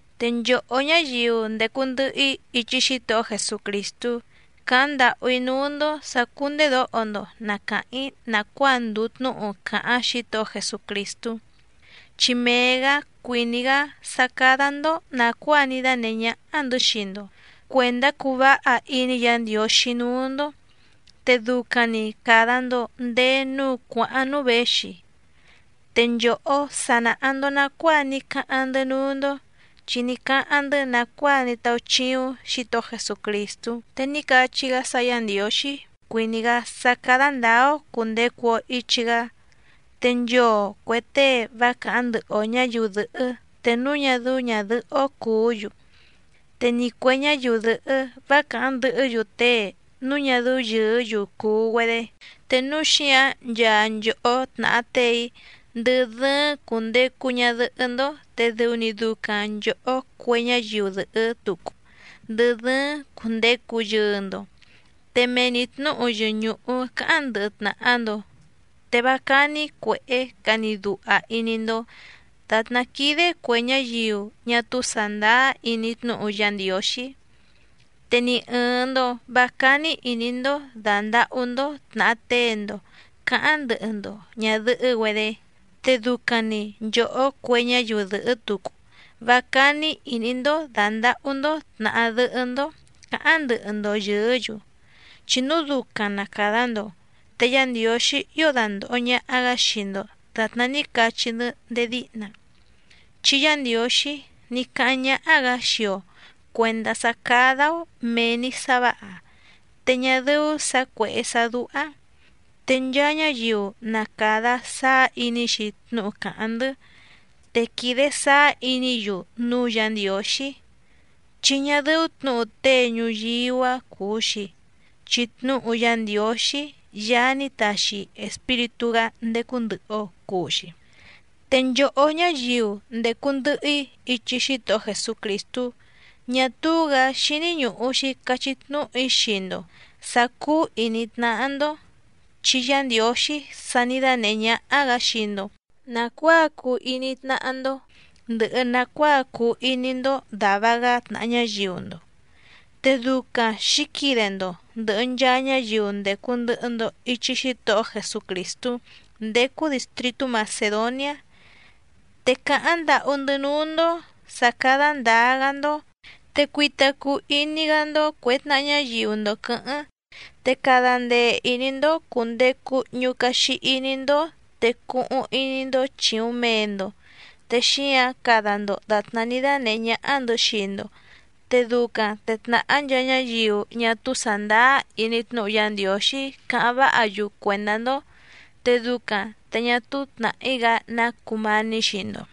Te nchòhó ñáyiu ndècu ndɨhɨ‑í ichi Xítohó Jesucrìstú càháⁿ ndàhú‑í núú‑ndó sǎ cúndèdóho‑ndo na càháⁿ‑í nàcuáa ndùu tnúhu càháⁿ Xítohó Jesucrìstú, chi mee‑gǎ cuìní‑gá sá cádá‑ndó nàcuáa ní dánèhé ñáhá‑ndɨ̌ xii‑ndo cuèndá cuu váha iní Yǎ Ndiǒxí núú‑ndó, te ducaⁿ‑ni càda‑ndo ndéé núú cuàháⁿ núú věxi. Te nchòhó sa nàha‑ndo nacuáa ní cáháⁿ‑ndɨ́ núú‑ndó, chi ní cáháⁿ‑ndɨ́ nàcuáa ní táúchíúⁿ Xǐtohó Jesucrìstú te ní cachí‑gá sá Yá Ndiǒxí cuìní‑gá sá cádá ndǎá‑ó cùndecu‑o ichi‑gá. Te nchoo cuè tée vá càháⁿ ndɨhɨ‑o ñǎyiu dɨ̀hɨ́ te núu ñá dɨ́ú ñàdɨhɨ́‑ó cùú‑yu, te ni cuè ñáyiu dɨ̀hɨ́ vá càháⁿ ndɨhɨ́‑yu tée núu ñá dɨ́ú yɨ̀ɨ́‑yu cùu‑güedé. Te núu xíǎⁿ nchaa nchòhó tnàha tée‑í ndɨ dɨ́ɨ́ⁿ cùndecu ñadɨhɨ́‑ndó, te dɨu‑ni ducaⁿ nchòhó cue ñáyiu dɨ̀hɨ́ tucu ndɨ dɨ́ɨ́ⁿ cùndecu yɨɨ‑ndo, te mee‑ni tnǔhu yɨñùhu cáháⁿ ndɨhɨ tnàha‑ndo. Te vá cání cuèhé cani duha iní‑ndó dàtná quídé cuè ñáyiu ñá túú sàndáá iní tnúhu Yá Ndiǒxí. Te ni ɨ̀ɨⁿ‑ndo vá cání ìní‑ndó dàndahú‑ndó tnàha tée‑ndo cǎháⁿ ndɨhɨ‑ndo ñàdɨhɨ́‑güedé. Te ducaⁿ‑ni nchòhó cue ñáyiu dɨ̀hɨ́ tucu vá cání ìní‑ndó dàndahú‑ndó tnàha dɨhɨ́‑ndó cǎháⁿ ndɨhɨ‑ndo yɨ̀ɨ́‑yu. Chi núu ducaⁿ na càda‑ndo, te Yá Ndiǒxí ío dandòho ñaha‑gá xii‑ndo dàtná ní cachí‑ndɨ́ ndéé díhna. Chi Yá Ndiǒxí ní cáháⁿ ñáhá‑gǎ xii‑o cuèndá sá cádá‑ó mèe‑ni sá vǎha, te ñá dɨ́ú sǎ cuèhé sá dúhá. Te nchaa ñáyiu na càda sáá iní‑xi tnúhu càháⁿ‑ndɨ́, te quìde sáá iní‑yu núú Yǎ Ndiǒxí, chi ñá dɨ́ú tnǔhu tée ñuyíú‑a cùu‑xi, chi tnúhu Yá Ndiǒxí, Yaá ní taxi Espíritú‑gá ndécú ndɨ̀hɨ‑o cuu‑xi. Te nchòhó ñáyiu ndècu ndɨhɨ‑í ichi Xítohó Jesucrìstú, ñá túú‑gǎ xíní ñùhu‑xi cachí tnúhu‑í xii‑ndo sǎ cúú ìní tnáhá‑ndó, chi Yá Ndiǒxí sa ní dánèhé ñáhá‑gǎ xii‑ndo nàcuáa cuu iní tnáhá‑ndó, ndɨhɨ nàcuáa cuu iní‑ndó dàva‑gá tnàha ñáyiu‑ndo. Te ducaⁿ xǐquide‑ndo ndɨ̀hɨ nchaa ñáyiu ndècu ndɨhɨ‑ndo ichi Xítohó Jesucrìstú ndécú dìstritú Macèdoniá. Te càháⁿ ndàhú‑ndɨ́ núú‑ndó sǎ cádá ndǎá‑gá‑ndó, te cuita cuu iní‑gá‑ndó cuè tnaha ñáyiu‑ndo quɨ̌hɨ́ⁿ. Te cada ndee ìní‑ndó cùndecu ñucaxi iní‑ndó, te cuhuⁿ iní‑ndó chìuⁿ mee‑ndo, te xíǎⁿ cada‑ndo dàtná ní dánèhé ñáhá‑ndɨ̌ xii‑ndo. Te ducaⁿ te tnàhá nchaa ñáyiu ñá túú sàndáá iní tnúhu Yá Ndiǒxí cáháⁿ váha‑yu cuèndá‑ndó, te ducaⁿ te ñá túú tnàhí‑gá ná cùmání xii‑ndo.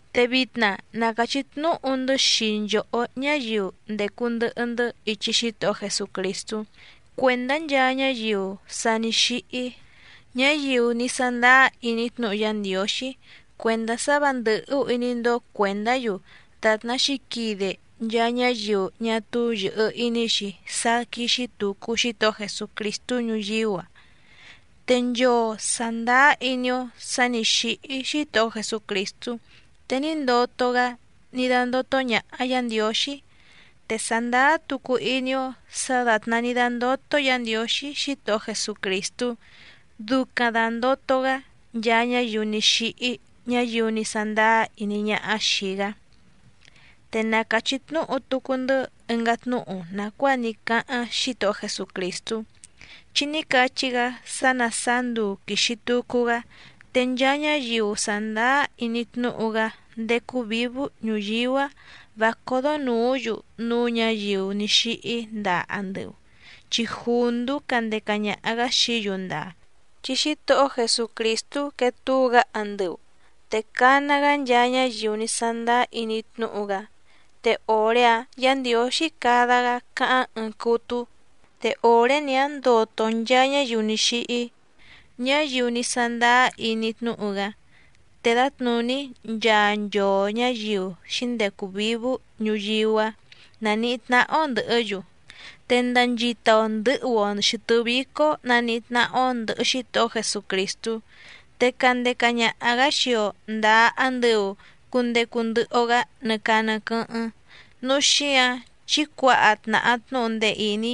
Te vitna na càchí tnúhu‑ndɨ́ xii nchòhó ñáyiu ndècu ndɨhɨ‑ndɨ́ ichi Xítohó Jesucrìstú cuèndá nchaa ñáyiu sa ní xíhí, ñáyiu ní sándáá iní tnúhu Yá Ndiǒxí cuèndá sá vǎ ndɨ̀hú iní‑ndó cuèndá‑yu dàtná xǐquide nchaa ñáyiu ñá túú yɨ̀hɨ iní‑xi sá quíxí tùcu Xítohó Jesucrìstú ñuyíú‑a. Te nchoo sàndáá iní‑ó sǎ nǐ xíhí Xítohó Jesucrìstú te ní ndoto‑gá ní dándótó ñàha Yá Ndiǒxí, te sàndáá tucu iní‑ó sǎ dàtná ní dándótó Yǎ Ndiǒxí Xítohó Jesucrìstú, ducaⁿ dàndoto‑gá nchaa ñáyiu ní xíhí ñáyiu ní sándáá iní ñáhá xìi‑gá. Te na càchí tnúhu tucu‑ndɨ́ ɨngá tnúhu nàcuáa ní cáháⁿ Xítohó Jesucrìstú, chi ní cachí‑gá sá ná sàá nduu quìxi tucu‑gá te nchaa ñáyiu sàndáá iní tnúhu‑gá ndécú vǐvú ñuyíú‑a vá códó nùú‑yu núú ñǎyiu ní xíhí ndaa andɨu, chi jùndú candeca ñaha‑gǎ xií‑yu ndaa. Chi Xítohó Jesucrìstú quee túu‑gá andɨu, te cana‑gá nchaa ñáyiu ní sándáá iní tnúhu‑gá, te òré‑áⁿ Yǎ Ndiǒxí cada‑gá te òré‑áⁿ, cáháⁿ ɨɨⁿ cútú te òré‑ni‑áⁿ ndoto nchaa ñáyiu ní xíhí, ñáyiu ní sándáá iní tnúhu‑gá. Te dǎtnùní nchaa nchoo ñǎyiu xǐndecu vǐvú ñuyíú‑a naníhí tnáhá‑ó ndɨ̀hɨ́‑yu, te ndanchita‑o ndɨ̌hu‑o xɨ̀tɨ́ vícó naníhí tnáhá‑ó ndɨ̀hɨ Xítohó Jesucrìstú, te candeca ñaha‑gǎ xii‑o ndàa andɨu cundecu ndɨhɨ‑o‑gá nɨ caa nɨ quɨ́hɨ́ⁿ. Núu xíǎⁿ chí cuǎha tnàha tnúhu ndee ìní,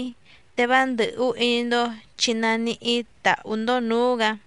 te vá ndɨ̀hú iní‑ndó chi naníhí tàhú‑ndó nǔú‑gǎ.